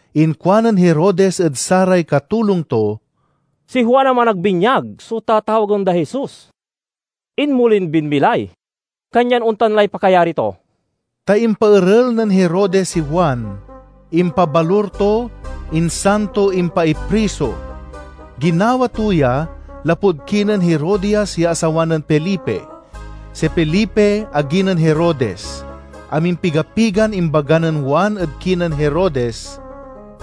Inkuanen Herodes ed saray katulong to, "Si Juan a Managbinyag so tatawagen day Jesus. Inmolin binmilay, kanyan ontan lay pakayari to." Ta impaerel nen Herodes si Juan, impabalur to, insan to impaipriso. Ginawa to ya, lapud kinen Herodias ya asawa nen Felipe. Si Felipe agi nen Herodes. Amimpiga-pigan imbaga nen Juan ed kinen Herodes,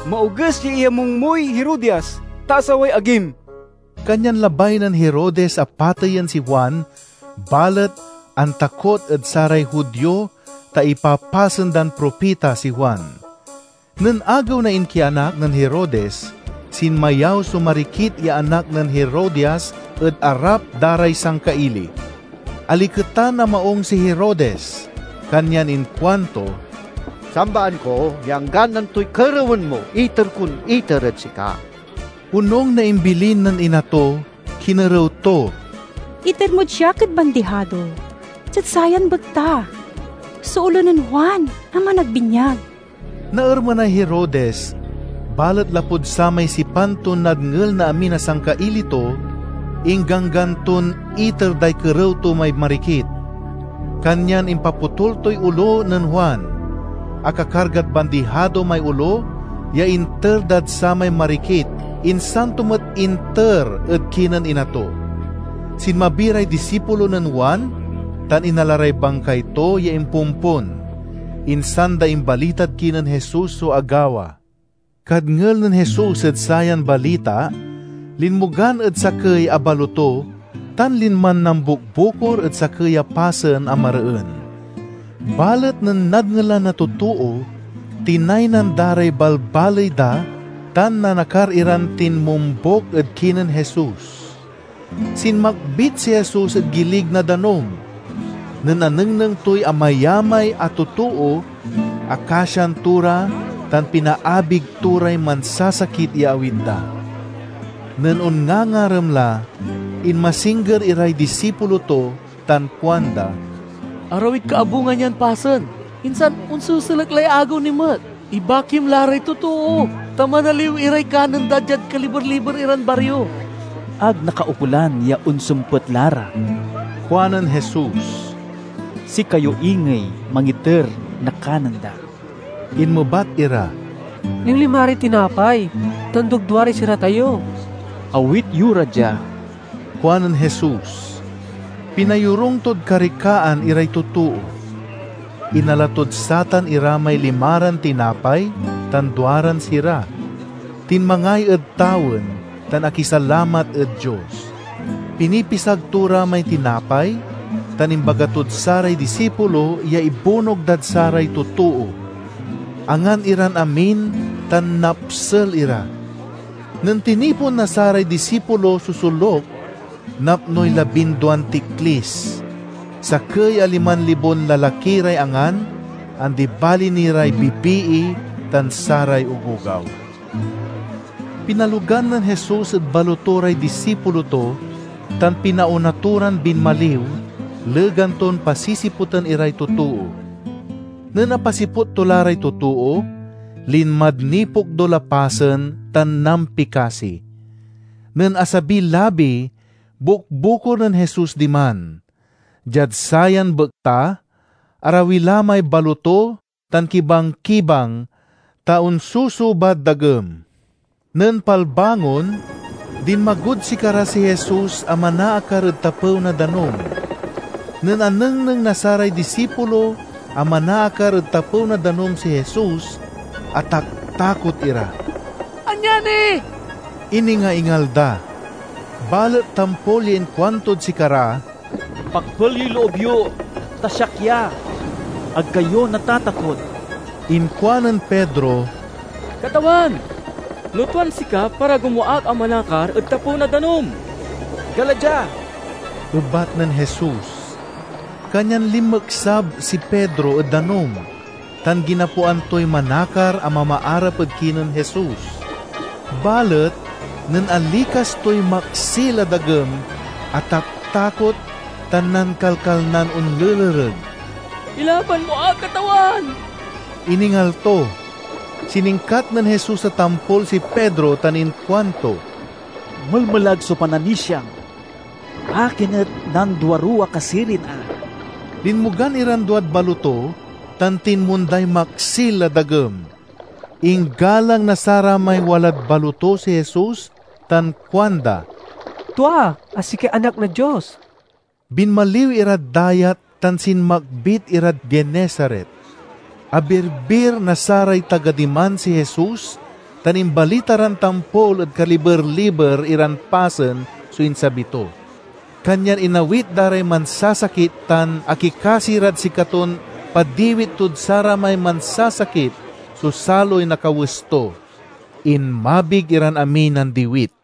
"Maoges ya iyamung moy Herodias, ta asaway agim!" Kanyan labay nen Herodes a pateyen si Juan, balet antakot ed saray Judio ta ipapasen dan propita si Juan. Nen agew na inkianak nen Herodes, sinmayaw so marikit ya anak nen Herodias ed arap da ray sangkaili. Aliketan a maung si Herodes. Kanyan inkuanto, "Sambaan ko ya anggan antoy kerewen mo, iter kon iter ed sika!" Onung na imbilin nen ina to kinerew to, "Iter mod siak ed bandihado, diad sayan bekta, so olo nen Juan a Managbinyag!" Naermenay Herodes, balet lapud samay sipan ton nadngel na amin a sangkaili to, ingganggan ton iter day kerew to may marikit. Kanyan impapotul toy olo nen Juan. Akakargad bandihado may olo ya inter dad samay marikit, insan to met inter ed kinen ina to. Sinmabi ray disipulo nen Juan tan inala ray bangkay to ya impompon. Insan da imbalitad kinen Jesus so agawa. Kadngel nen Jesus ed sayan balita, linmogan ed sakey a baloto, tan linman nambukbukor ed sakey a pasen a mareen. Balet nen nadngelan na totoo, tinaynan da ray balbaley da tan nanakar iran tinmombuk ed kinen Jesus. Sinmakbit si Jesus ed gilig na danum. Nen anengneng toy amayamay a totoo, akasian to ra tan pinaabig to ray mansasakit ya awit da. Nen onngangarem la, inmasingger iray disipulo to tan kuanda, "Arawid kaabungan yan pasen, insan onseselek lay agew ni met. Ibakim la ray totoo, ta manaliw iray kanen da diad kaliber-liber iran bario." "Ag nakaukolan ya onsempet la ra," kuanen Jesus. "Sikayo ingey mangiter na kanen da." Inmebat ira, "Limlimaray tinapay tan dugduaray sira tayo." "Awit yo ra dia," kuanen Jesus. Pinayorung tod karikaan iray totoo. Inala tod satan ira may limaran tinapay tan duaran sira, tinmangay ed tawen tan akisalamat ed Dios. Pinipisag to ra may tinapay tan imbaga tod saray disipulo ya ibunog dad saray totoo. Angan iran amin tan napsel ira. Nen tinipon na saray disipulo so soluk napnoy labinduan tiklis. Sakey a liman libon lalaki ray angan, andi bali ni ray bibii tan saray ogogaw. Pinalogan nen Jesus ed baloto ray disipulo to, tan pinaona to ran binmaliw, legan ton pasisiputen iray totoo. Nen apasiput to la ray totoo, linmad nipokdul a pasen tan nampikasi. Nen asabiy labi, bukbukor nen Jesus diman. Diad sayan bekta arawi la may baloto tan kibang-kibang, ta onsusubad dagem. Nen palbangon, dinmagod sikara si Jesus a manaakar ed tapew na danum. Nen anengneng na saray disipulo a manaakar ed tapew na danum si Jesus, ataktakot ira. "Anyani!" iningaingal da. Balet tampol ya inkuantod sikara, "Pakpel yoy loob yo, ta siak ya. Ag kayo natatakot!" Inkuanen Pedro, "Katawan, no tuan sika, parago mo ak a manakar ed tapew na danum." "Gala dia," ebat nen Jesus. Kanyan linmeksab si Pedro ed danum, tan ginapoan toy manakar a mamaarap ed kinen Jesus. Balet nen alikas toy maksil a dagem, ataktakot tan nankalkalnan onlelereg. "Ilaban mo ak, Katawan!" iningal to. Siningkat nen Jesus a tampol si Pedro tan inkuanto, "Melmelag so pananisiam! Akin et nanduaruwa ka sirin a?" Linmogan iran duad baloto, tan tinmonday maksil a dagem. Inggalang na saramay walad baloto si Jesus tan kuanda, "Tua a sikay Anak na Dios!" Binmaliw irad dayat tan sinmakbit irad Genesaret. Abirbir na saray taga diman si Jesus tan imbalita ran tampol ed kaliber-liber iran pasen so insabi to. Kanyan inawit da ray mansasakit tan akikasi rad sikaton padiwit tod saramay mansasakit so saloy na kawes to. Inmabig iran amiy nandiwit.